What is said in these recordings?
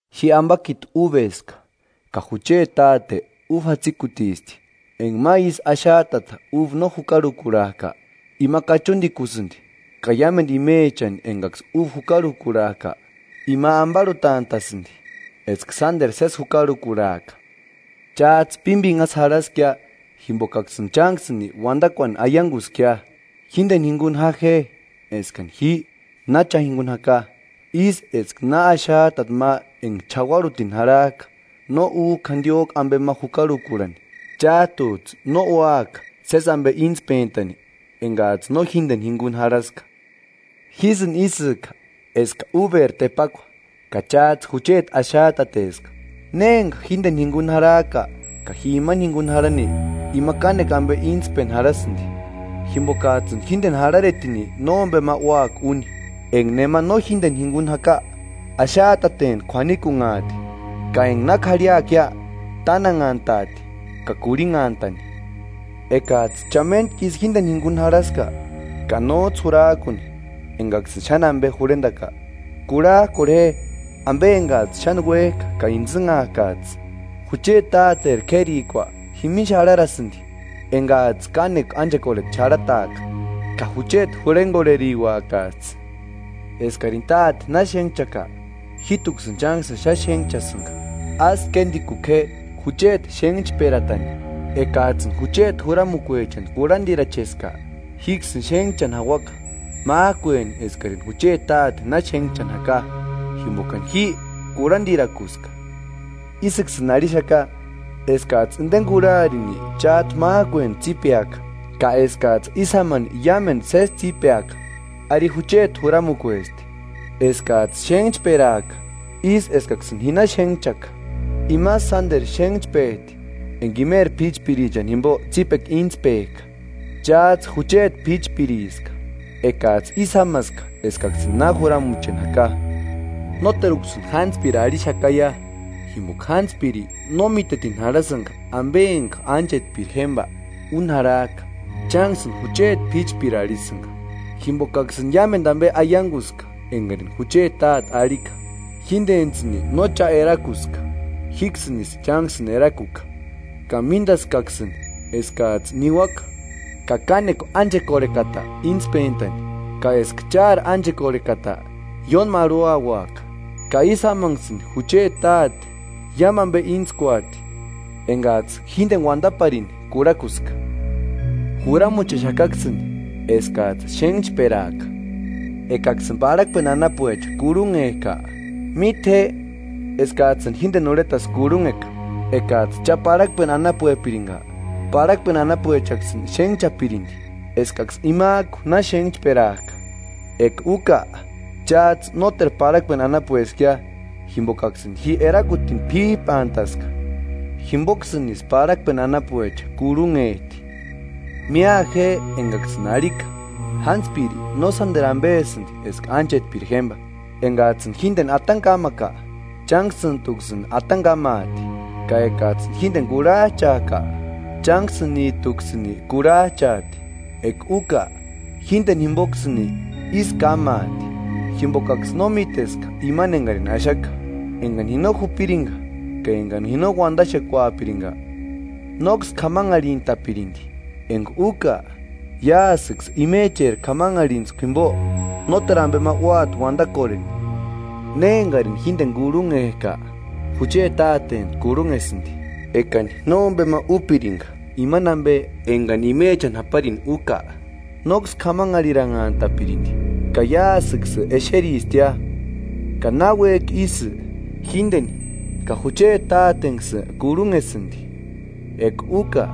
Ji ambakiti úbeska, ka jucheti Táte úba jatsikutisti. Enga ma ísï axajtata uba no jukarhukurhajka, ima kachundikusïndi, ka iámendu imechani engaksï uba jukarhukurhajka, Ima ambarhutantasïndi, eska sánderu sési jukarhukurhaaka. Chájtsï pímbinhasï jarhaskia jimbokaksïni chánksïni Uandakuani aianguskia. Jíndeni jinguni ja je, eskani ji na cha jinguni jaka. Ísï eska na axajtata ma enga ch'auarhutini jarhajka no újka jandiójku ambe ma jukarhukurhani; chájtujtsï no úaka sési ambe íntspentani engajtsï no jíndeni jinguni jarhaska. Jísïni ísïka eska úberi tepakua ka chájtsï jucheti axajtateska. Ne enga jíndeni jinguni jarhajka ka ji imani jingunini jarhani, ima kánekua ambe íntspeni jarhasïndi; jimbokajtsïni jíndeni jarharetini nómbema úaka úni. Enga nema no jíndeni jinguni jaka, axajtateni k'uanikunhaati ka enga na k'arhiakia, tánanhantati ka kurhinhantani. “Ekajtsï cha méntkisï jíndeni jinguni jarhaska, ka nójtsï jurajkuni engaksïni xáni ambe jurhendaka, kurhajkorhe je ambe engajtsï xáni uéjka ka intsïnhaakajtsï. Jucheti Táteri k'érikua jimini xárharasïndi engajtsï kánekua ánchekorheta xarhataaka, ka jucheti jurhengorheriuakajtsï. Eskarini Táte na xénhchaka, jíjtuksïni chánksïni xáni xénhchasïnga; ásï kéndikuku je jucheti xénhchperatani. Ekajtsïni jucheti juramukuechani kurhandiracheska, jíksïni xénhchani jauaka, májkueni eskarini jucheti Táteni na xénhchani jaka jimbokani ji kurhandirakuska.” “Ísïksïni arhixaka eskajtsï indeni kurharini chájtu májkueni tsípeaka, ka eskajtsï ísï jámani iámumendu sési tsípeaka. Ari jucheti juramukuesti: Eskajtsï xénhchperaaka ísï eskaksïni ji na xénhchkaka. Imasï sánderu xénhchpejti enga imeri p'íchprichani jimbo tsípekua íntspejka. Chájtsï jucheti píchpiriska, ekajtsï ísï jámaska eskaksïni na juramucheni jaka. Nóteruksïni jántspiri arhixakaia, jimboka jántspiri no mítetini jarhasïnga ambe enga ánchetpiri jémba úni jarhajka; chánksïni jucheti p'íchpiri arhisïnga, jimbokaksïni iámendu ambe aianguska engarini jucheti Táte arhika. Jíndentsïni no cha erakuska, jíksïnisï chánksïni erakuka, ka míndaskaksïni eskajtsï niuaka ka kánekua ánchekorhekata íntspentani, ka eska chári ánchekorhekata ióni marhuauaka; ka ísï jámanksïni jucheti Táte iámu ambe íntskuati engajtsï jíndeni uandaparini kurhakuska. Juramuchexakaksïni eskajtsï xénhchperaaka.” Ekaksïni parhakpeni anapuecha kurhunhejka, míte je eskajtsïni jíndeni urhetasï kurhunheka. Ekajtsï cha parhakpeni anapuepiringa, parhakpeni anapuechaksïni xénhchapirindi, eskaksï imajku na xénhchperajka. Eka úka, chájtsï nóteru parhakpeni anapueskia jimbokaksïni ji erakutini p'íjpantaska, jimboksïnisï parhakpeni anapuecha kurhunhejti. Mía je engaksïni arhika: Jántspiri no sánderu ambesïndi eska ánchetpiri jémba. Engajtsïni jíndeni atani kámaka, chánksïntuksïni atani kámaati; ka ekajtsïni jíndeni kurhajchajka, chánksïnijtuksïni kurhajchaati. Eka úka, jíndeni jimboksïnisï ísï kámaati, jimbokaksï no míteska imani engarini axaka. Engani ji no jupiringa ka engani ji no uandaxekuapiringa, nóksï k'amanharhintapirindi; enga úka iásïksï imecheri k'amanharhintskua jimbo nóteru ambe ma úati uandakorheni; Né engarini jíndeni kurhunhejka, jucheti Tátentu kurhunhesïndi. Ekani nómbema úpiringa imani ambe engani imechani japari úka, nóksï k'amanharhintapirindi; ka iásïksï exeristia, ka náuejki isï, jíndeni ka jucheti Tátentsïni kurhunhesïndi. Eka úka,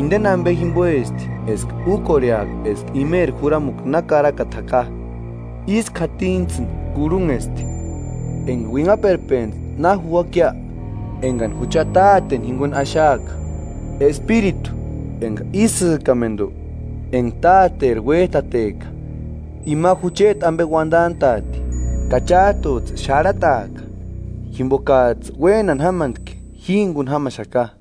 inde ambe jimboesti eska úkorheaka eska imecheri juramukua na karakata jaka: Ísku jatinijtsïni kurhunhesti. Enga uinhaperpentsti na juuakia, engani jucha Táteni jinguni axaaka, Espiritu enga isïkamendu, enga Táteri uéjtateka, ima jucheti ambe uandantaati. Ka chájtujtsï xárhataaka, jimbokajtsï uénani jámantki ji jinguni jamaxaka.